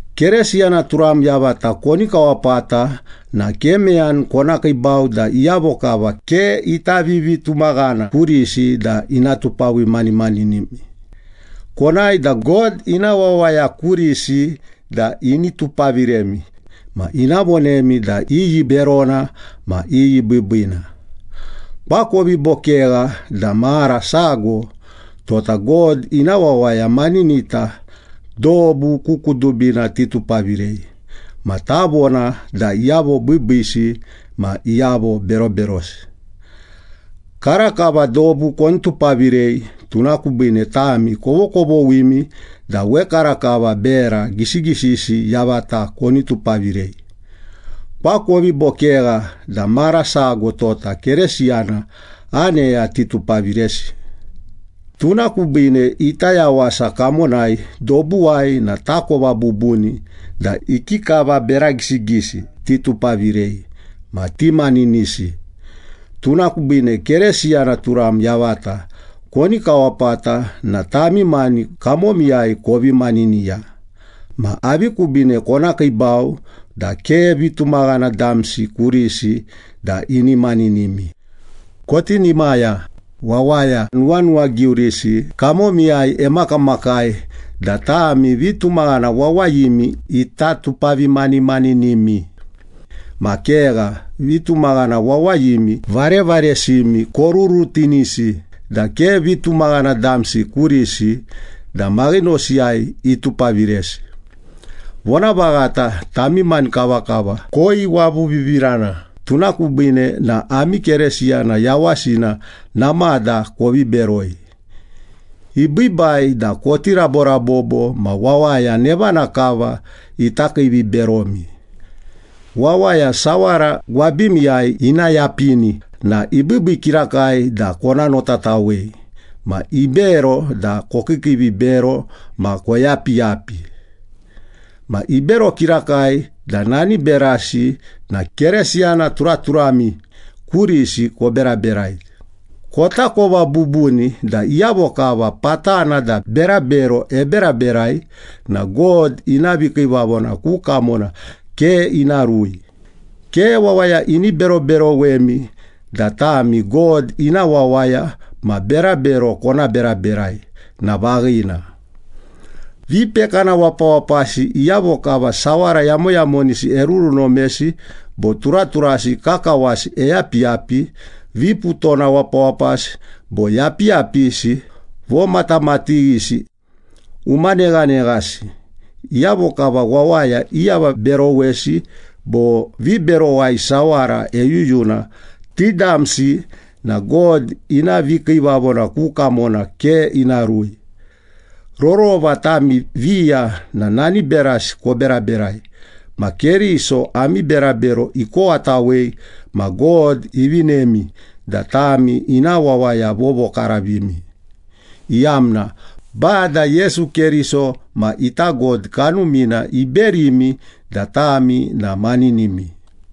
Keresiyana turam yavata koni kawapata na ke meyani kona kiibau da iyavo kava ke ita vivitumaghana kurisi da ina tupavimaninimi. Konae da God ina wawaya kurisi da ini tupaviremi ma ina vonemi da iyi berona ma iyi biibiina. Koakovi bo kegha da mara sago tota God ina wawaya maninita dobu ku kudubina titupavirei ma tavona da iyavo biibiisi ma iyavo beroberosi. Karakava dobu koni tupavirei, tuna kubiine tami kovokovoghimi da wekarakava bera gisigisi yavata koni tupavirei. Koakovi bo kegha da mara sago tota Keresiyana aneya titupaviresi? Tuna kubiine ita yawasa kamonai dobuwai na takova bubuni da ikikava bera gisigisi titupavirei ma timaninisi. Tuna kubiine Keresiyana turam yavata koni kawapata na tami mani kamomiyai kovi maniniya. Ma avi kubiine kona kiibau da ke vitumaghana damsi kurisi da ini maninimi? Kotinimaya! Wawaya nuwanuwagiurisi kamomiyai emakamakai da tami vitumaghana wawayimi ita tupavimanimaninimi. Ma kegha, vitumaghana wawayimi varevaresimi korurutinisi da ke vitumaghana damsi kurisi da maghinosiyai itupaviresi. Vonavaghata, tami mani kavakava koiwavuvivirana, tuna kubiine na ami Keresiyana yawasina namada kovi beroi. Ibiibai da koti raborabobo ma wawaya nevana kava ita kiiviberomi. Wawaya sawara gwabimiyai ina yapini na ibiibii kirakai da kona notatawei. Ma ibero da kokiikiivibero ma koyapiyapi. Ma ibero kirakai da nani berasi na Keresiyana turaturami kurisi koberaberai. Kotakova bubuni da iyavo kava patana da berabero eberaberai na God ina vikiivavona ku kamona ke ina rui. Ke wawaya ini beroberowemi da tami God ina wawaya ma berabero kona beraberai na vaghina. Vipekana wapawapasi, iyavo kava sawara yamoyamonisi erurunomesi bo turaturasi kakawasi eyapiyapi, viputona wapawapasi, bo yapiyapisi, vomatamatighisi, umaneghaneghasi, iyavo kava wawaya iavaberowesi bo viberowai sawara eyuyuna, ti damsi na God ina vikiivavona ku kamona ke ina rui. Rorova tami viya na nani berasi koberaberai. Ma Keriso ami berabero ikowatawei ma God ivinemi da tami ina wawaya vovokaravimi, iyamna Bada Yesu Keriso ma ita God Kanumina iberimi da tami na maninimi.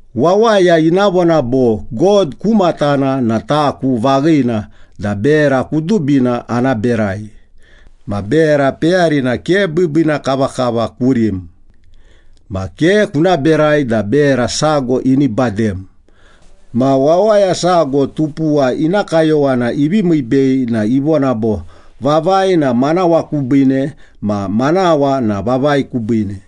Wawaya ina vona bo, “God ku matana na taku vaghina da bera kudubina ana berai.” Ma bera peyarina ke biibiina kavakava kurim. Ma ke kuna berai da bera sago ini badem. Ma wawaya sago tupuwa ina kayowana ivi miibei na ivona bo, “Vavai na manawa kubiine ma manawa na vavai kubiine.”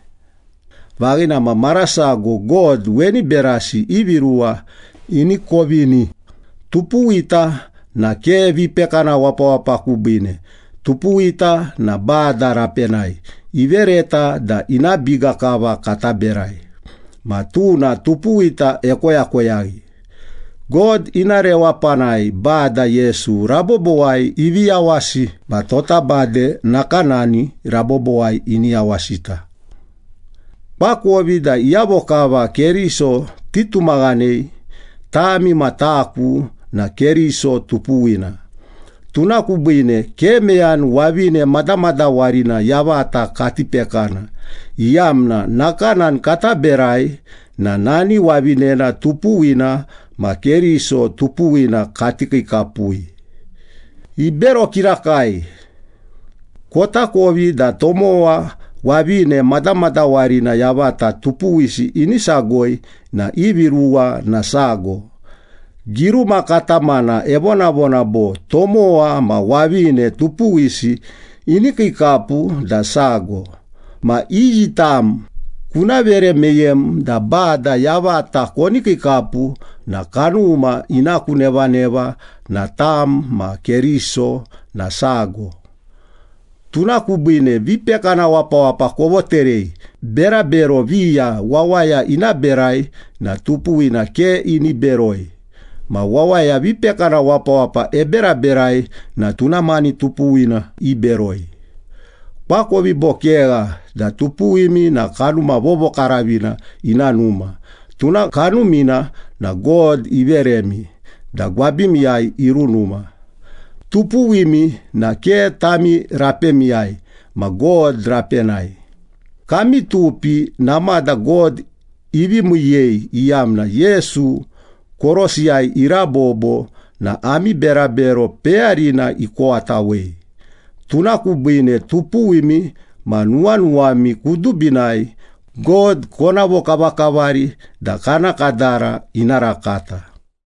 Vaghina, ma mara sago God weni berasi ivi ruwa ini kovini. Tupuwita na ke vipekana wapawapa kubiine. Tupuwita na Bada rapenai, ivereta da ina biga kava kata berai. Ma tuna tupuwita ekoyakoyaghi. God ina rewapanai Bada Yesu rabobowai ivi yawasi ma tota bade nakanani rabobowai ini yawasita. Koakovi da iyavo kava Keriso titumaghanei, tami ma taku na Keriso tupuwina. Tuna kubiine ke meyani wavine madamadawarina yavata kati pekana iyamna nakanani kata berai na nani wavinena tupuwina ma Keriso tupuwina kati kiikapui. Ibero kirakai! Kotakovi da tomowa, wavine madamadawarina yavata tupuwisi ini sagoi na ivi ruwa na sago. Giruma katamana evonavona bo, “Tomowa ma wavine tupuwisi ini kiikapu da sago.” Ma iyi tam kuna vere meyem da Bada yavata koni kiikapu na kanuma ina ku nevaneva na tam ma Keriso na sago. Tuna kubiine vipekana wapawapa kovoterei. Berabero viya wawaya ina berai na tupuwina ke ini beroi. Ma wawaya vipekana wapawapa eberaberai na tuna mani tupuwina iberoi. Koakovi bo kegha da tupuwimi na Kanuma Vovokaravina ina numa? Tuna Kanumina na God iveremi da gwabimiyai irunuma. Tupuwimi na ke tami rapemiyai ma God rapenai. Kami tupi namada God ivi miiyei, iyamna Yesu korosiyai irabobo na ami berabero peyarina ikowatawei. Tuna kubiine, tupuwimi ma nuwanuwami kudubinai God kona vokavakavari da kana kadara ina rakata.